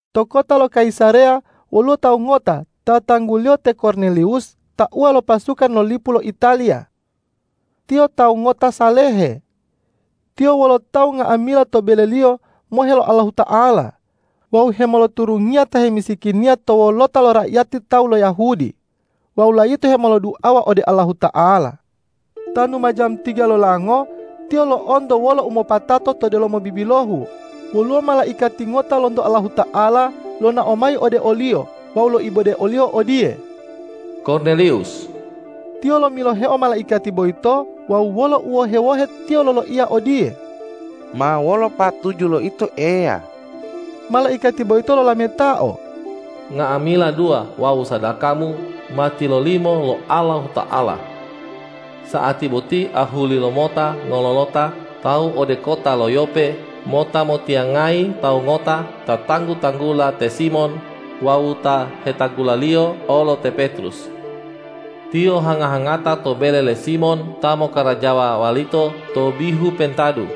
To kota lo Kayisareya woluwo tawu ngota ta tangguliyo te Korneliwus tauwa lo pasukan lo lipu lo Italiya. Tiyo tawu ngota salehe. Tiyo wolo tawu nga'amila to beleliyo mohe lo Allahuta'ala wawu hemoloturungiya ta hemisikiniya to wolota lo raiyati tawu lo Yahudi wawu layito hemoloduawa ode Allahuta'ala. Tanu ma jamu tiga lolango tiyo lo'onto wolo umopatato to delomo bibilohu woluwo malaikati ngota lonto Allahuta'ala lonao mayi ode oliyo wawu loibode oliyo odiye,”Korneliwus!” Tiyo lomiloheo malaikati boyito wawu wolo uwohe-wohe tiyo loloiya odiye,”Ma wolo patuju lo Ito Eya?” Malaikati boyito lolametao,”Nga'amila dua wawu sadakamu ma tilolimo lo Allahuta'ala. Sa'ati boti ahuli lomota ngololota tawu ode kota lo Yope mota motiyangayi tawu ngota ta tanggu-tanggula te Simon wawu ta hetanggulaliyo olo te Petrus. Tiyo hanga-hangata to bele le Simon ta mokkarajawa walito to bihu pentadu.”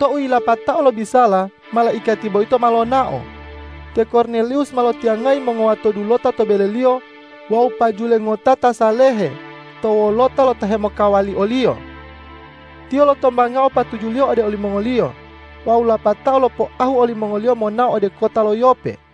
Tou yilapatao lobisala, malaikati boyito ma lonao. Te Korneliwus ma lotiyangayi mongowato dulota to beleliyo wawu pajule ngota ta salehe to wolota lo ta hemokawali oliyo. Tiyo lotombangao patujuliyo ode olimongoliyo wawu lapatao lopoahu olimongoliyo monao ode kota lo Yope.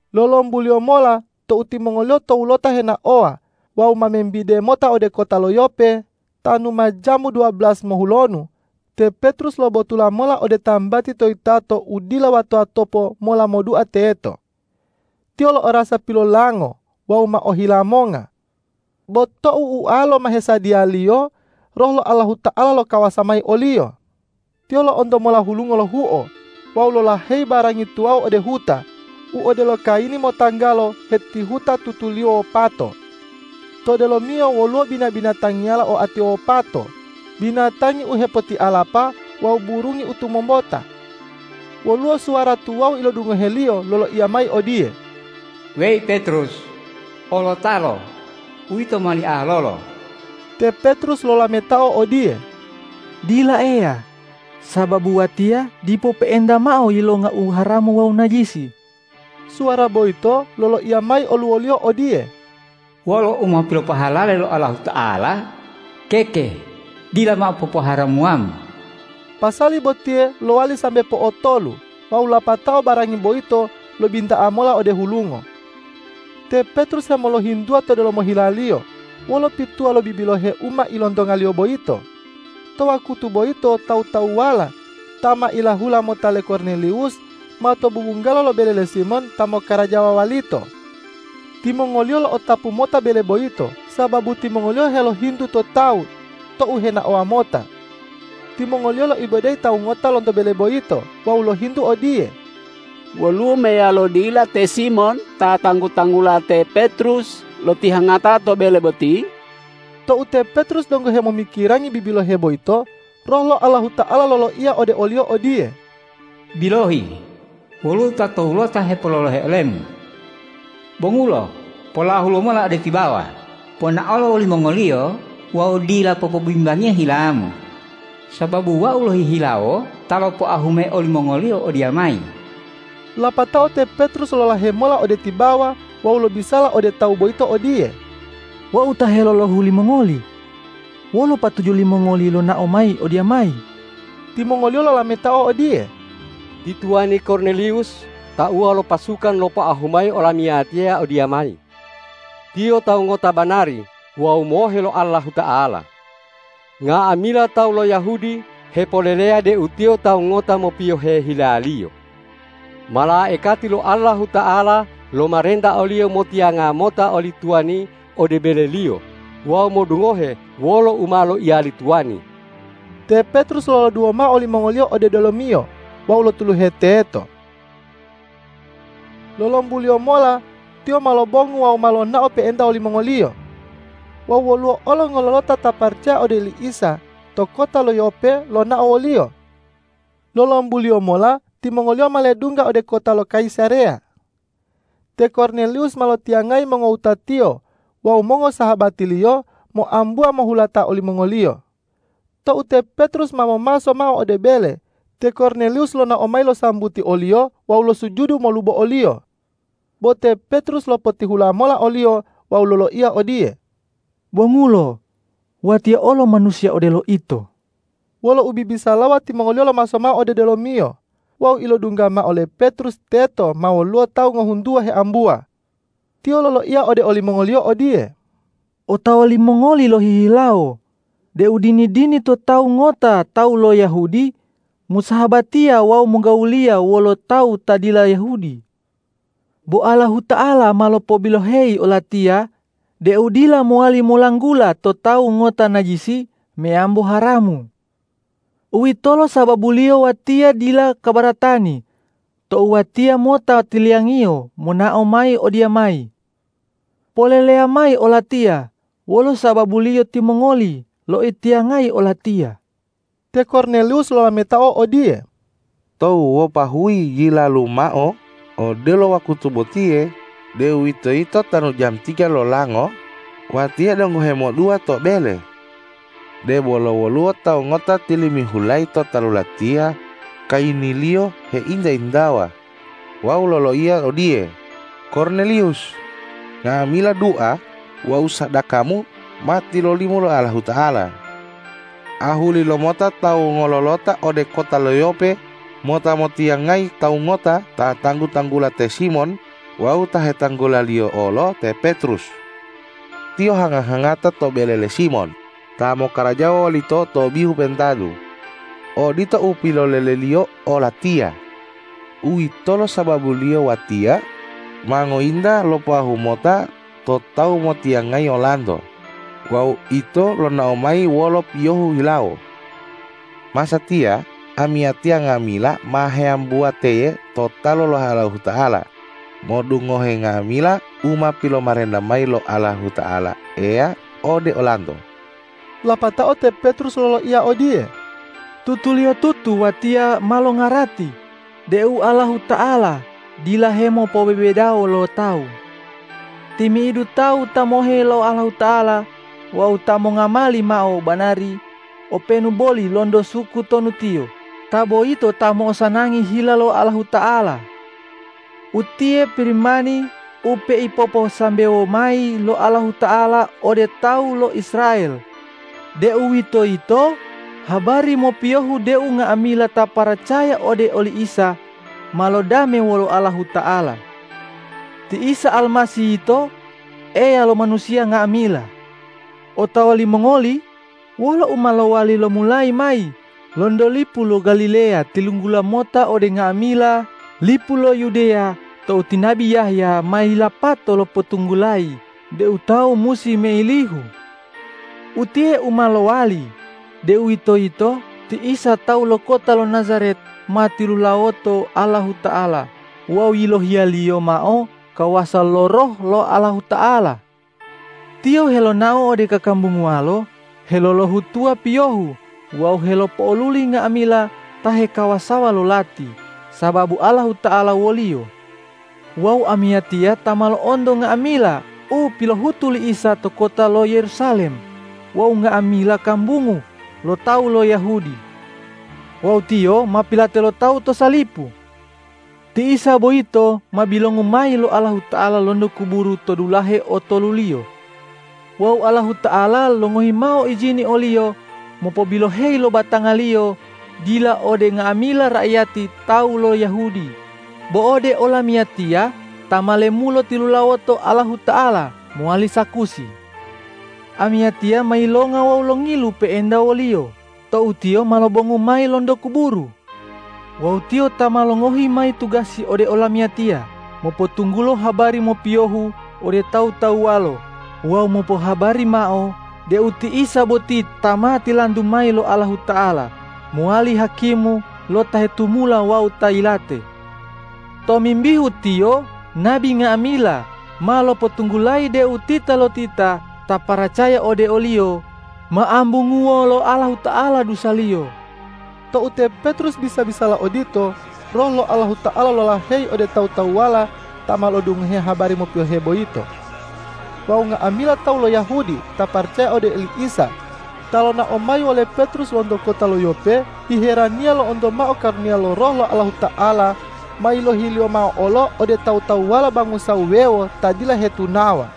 Lolombuliyo mola tou timongoliyo towulota henaowa wawu ma membide mota ode kota lo Yope, tanu ma jamu duwabelas mohulonu, te Petrus lobotula mola ode tambati to yitato u dila wato-watopo mola modua teto. Tiyo lo'orasa pilolango wawu ma ohila monga. Bo tou ualo ma hesadiyaliyo, Roh lo Allahuta'ala lokawasa mayi oliyo. Tiyo lo'onto mola hulungo lohuo wawu lolaheyi barangi tuwawu ode huta u odelo kayini motanggalo hetihuta tutuliyo wopato. To delomiyo woluwo bina-binatangiyala oatiyo wopato, binatangi u hepotialapa wawu burungi u tumombota. Woluwo suwara tuwawu ilodungoheliyo loloiya mayi odiye,”Weyi Petrus, olotalo, uwito mowali alolo!” Te Petrus lolametao odiye,”Dila Eya, sababu watiya dipo pe'enta mao yilonga u haramu wawu najisi.” Suwara boyito loloiya mayi oluwoliyo odiye,”Wolo u ma pilopohalale lo Allahuta'ala, keke dila mao popoharamuwamu.” Pasali botiye lowali sambe po'otolu wawu lapatao barangi boyito lobinta'a mola ode hulungo. Te Petrus hemoloyintuwa to delomo hilaliyo, wolo pituwa lo bibilohe u ma ilontongaliyo boyito. To wakutu boyito tawu-tawuwala ta ma ilahula mota le Korneliwus, ma to bubunggalo lo bele le Simon ta mokkarajawa walito. Timongoliyo lo'otapu mota bele boyito, sababu timongoliyo helohintu to tawu tou henaowa mota. Timongoliyo loibodeyi tawu ngota lonto bele boyito wawu lohintu odiye,”Woluwo meyalo dila te Simon ta tanggu-tanggula te Petrus lotihangata to bele boti?” Tou te Petrus donggo hemomikirangi bibilohe boyito, Roh lo Allahuta'ala loloiya ode oliyo odiye,”Bilohi, woluwo ta towulota hepololohe olemu. Bongulo, polahu lomola ode tibawa, ponaolo wolimongoliyo wawu dila popobimbangiya hilamu, sababu Wau lohihilawo ta lopoahu mayi olimongoliyo odiyamayi.” Lapatao te Petrus lolahe mola ode tibawa wawu lobisala ode tawu boyito odiye,”Wau ta helolohu limongoli. Wolo patuju limongoli lonao mayi odiyamayi?” Timongoliyo lolametao odiye,”Ti tuwani Korneliwus tauwa lo pasukan lopoahu mayi olamiyatiya odiyamayi. Tiyo tawu ngota banari wawu mohe lo Allahuta'ala. Nga'amila tawu lo Yahudi hepoleleya deu tiyo tawu ngota mopiyohe hilaliyo. Malaikati lo Allahuta'ala lomarenta oliyo motiyanga mota oli tuwani ode beleliyo wawu modungohe wolo u ma loiya li tuwani.” Te Petrus loloduwo mao olimongoliyo ode delomiyo wawu lotuluhe teto. Lolombuliyo mola tiyo ma lobongu wawu ma lonao pe'enta wolimongoliyo. Wawu woluwo olo ngololota ta paracaya ode oli Isa to kota lo Yope lonao woliyo. Lolombuliyo mola timongoliyo ma ledungga ode kota lo Kayisareya. Te Korneliwus ma lotiyangayi mongowutatiyo wawu mongosahabatiliyo moambuwa mohulata olimongoliyo. Tou te Petrus ma momaso mao ode bele, te Korneliwus lonao mayi losambuti oliyo wawu losujudu molubo oliyo. Bo te Petrus lopotihula mola oliyo wawu loloiya odiye,”Bongulo! Watiya olo manusiya odelo ito.” Wolo ubibisalawa timongoliyo lomaso mao ode delomiyo wawu ilodungga mao le Petrus teto ma woluwo tawu ngohuntuwa heambuwa. Tiyo loloiya ode olimongoliyo odiye,”Otawa limongoli lohihilawo deu dini-dini to tawu ngota tawu lo Yahudi mosahabatiya wawu mogawuliya wolo tawu ta dila Yahudi. Bo Allahuta'ala ma lopobiloheyi olatiya deu dila mowali molanggula to tawu ngota najisi meyambo haramu. Uwitolo sababuliyo watiya dila kabaratani tou watiya mota tiliyangiyo monao mayi odiyamayi. Poleleya mayi olatiya wolo sababuliyo timongoli loitiyangayi olatiya.” Te Korneliwus lolametao odiye,”Tou wopahuyi yilalu mao, odelo wakutu botiye, deuwitoyito tanu jamu tiga lolango, watiya donggo hemodua to bele. Debolo woluwo tawu ngota tilimihulayi to talu latiya, kayiniliyo heinta-intawa wawu loloiya odiye, ’Korneliwus! Nga'amila dua wawu sadakamu ma tilolimo lo Allahuta'ala. Ahuli lomota tawu ngololota ode kota lo Yope mota motiyangayi tawu ngota ta tanggu-tanggula te Simon wawu ta hetanggulaliyo olo te Petrus. Tiyo hanga-hangata to bele le Simon ta mokkarajawa walito to bihu pentadu.’ Odito u piloleleliyo olatiya. Uwitolo sababuliyo watiya ma ngointa lopoahu mota to tawu motiyangayi olanto wawu ito lonao mayi wolo piyohu hilawo. Masatiya amiyatiya nga'amila ma heambuwa teye to talu lo Allahuta'ala, modungohe nga'amila u ma pilomarenta mayi lo Allahuta'ala Eya ode olanto.” Lapatao te Petrus loloiya odiye,”Tutuliyotutu watiya ma longarati deu Allahuta'ala dila hemopobebedawo lo tawu. Timi'idu tawu ta mohe lo Allahuta'ala wawu ta mongamali mao u banari, openu boli lonto suku tonu tiyo, ta boyito ta mo'osanangi hila lo Allahuta'ala. Utiye Pirimani u peipoposambewo mayi lo Allahuta'ala ode tawu lo Israel, deuwitoyito habari mopiyohu deu nga'amila ta paracaya ode oli Isa ma lodame wolo Allahuta'ala. Ti Isa Almasih yito, Eya lo manusiya nga'amila. Otawa limongoli wolo u ma lowali lomulayi mayi lonto lipu lo Galileya tilunggula mota ode nga'amila lipu lo Yudeya tou ti nabi Yahya ma yilapato lopotunggulayi deu tawu musi meilihu. Utiye u ma lowali, deuwitoyito ti Isa tawu lo kota lo Najaret ma tilulawoto Allahuta'ala wawu yilohiya-Liyo mao kawasa lo Roh lo Allahuta'ala. Tiyo helonao ode kakambunguwalo helolohutuwa piyohu wawu helopo'oluli nga'amila ta hekawasawa lo lati, sababu Allahuta'ala wo-Liyo. Wawu amiyatiya ta ma lo'onto nga'amila u pilohutu li Isa to kota lo Yerusalem wawu nga'amila kambungu lo tawu lo Yahudi. Wawu Tiyo ma pilate lo tawu to salipu. Ti Isa boyito ma bilongu mayi lo Allahuta'ala lonto kuburu to dulahe otoluliyo. Wawu Allahuta'ala longohi mao ijini o-Liyo mopobiloheyi lo batanga-Liyo, dila ode nga'amila raiyati tawu lo Yahudi, bo ode olamiyatiya ta ma lemulo tilulawoto Allahuta'ala mowali sakusi. Amiyatiya ma yilonga wawu longilu pe'enta wo-Liyo tou Tiyo ma lobongu mayi lonto kuburu. Wawu Tiyo ta ma longohi mayi tugasi ode olamiyatiya mopotunggulo habari mopiyohu ode tawu-tawuwalo wawu mopohabari mao deu ti Isa boti ta ma tilantu mayi lo Allahuta'ala mowali Hakimu lo ta hetumula wawu ta yilate. Tomimbihu Tiyo nabi nga'amila ma lopotunggulayi deu titalotita ta paracaya ode o-Liyo, ma ambunguwo lo Allahuta'ala dusaliyo.” Tou te Petrus bisa-bisala odito, Roh lo Allahuta'ala lolaheyi ode tawu-tawuwala ta ma lo'odungohe habari mopiyohe boyito. Wawu nga'amila tawu lo Yahudi ta paracaya ode oli Isa, ta lonao mayi wole Petrus lonto kota lo Yope, hiheraniya lo'onto mao karuniya lo Roh lo Allahuta'ala ma yilohi-Liyo mao olo ode tawu-tawuwala bangusa wuwewo ta dila hetunawa.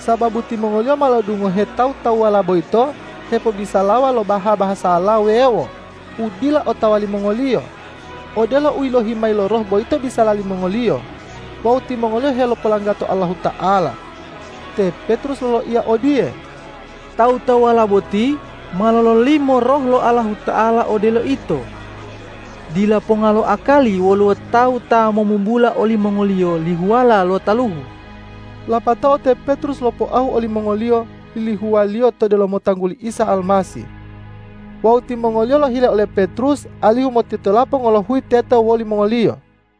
Sababu timongoliyo ma lo'odungohe tawu-tawuwala boyito hepobisalawa lo baha-bahasala wuwewo u dila otawa limongoliyo, odelo u yilohi mayi lo Roh boyito bisala limongoliyo wawu timongoliyo helopolanggato Allahuta'ala. Te Petrus loloiya odiye, ”Tawu-tawuwala boti ma lololimo Roh lo Allahuta'ala odelo ito. Dila ponga lo akali woluwo tawu ta momubula olimongoliyo lihuwala lo taluhu.” Lapatao te Petrus lopoahu olimongoliyo lihuwaliyo to delomo tangguli Isa Almasih. Wawu timongoliyo lohile ole Petrus alihu motitolapo ngolohuyi teto wolimongoliyo.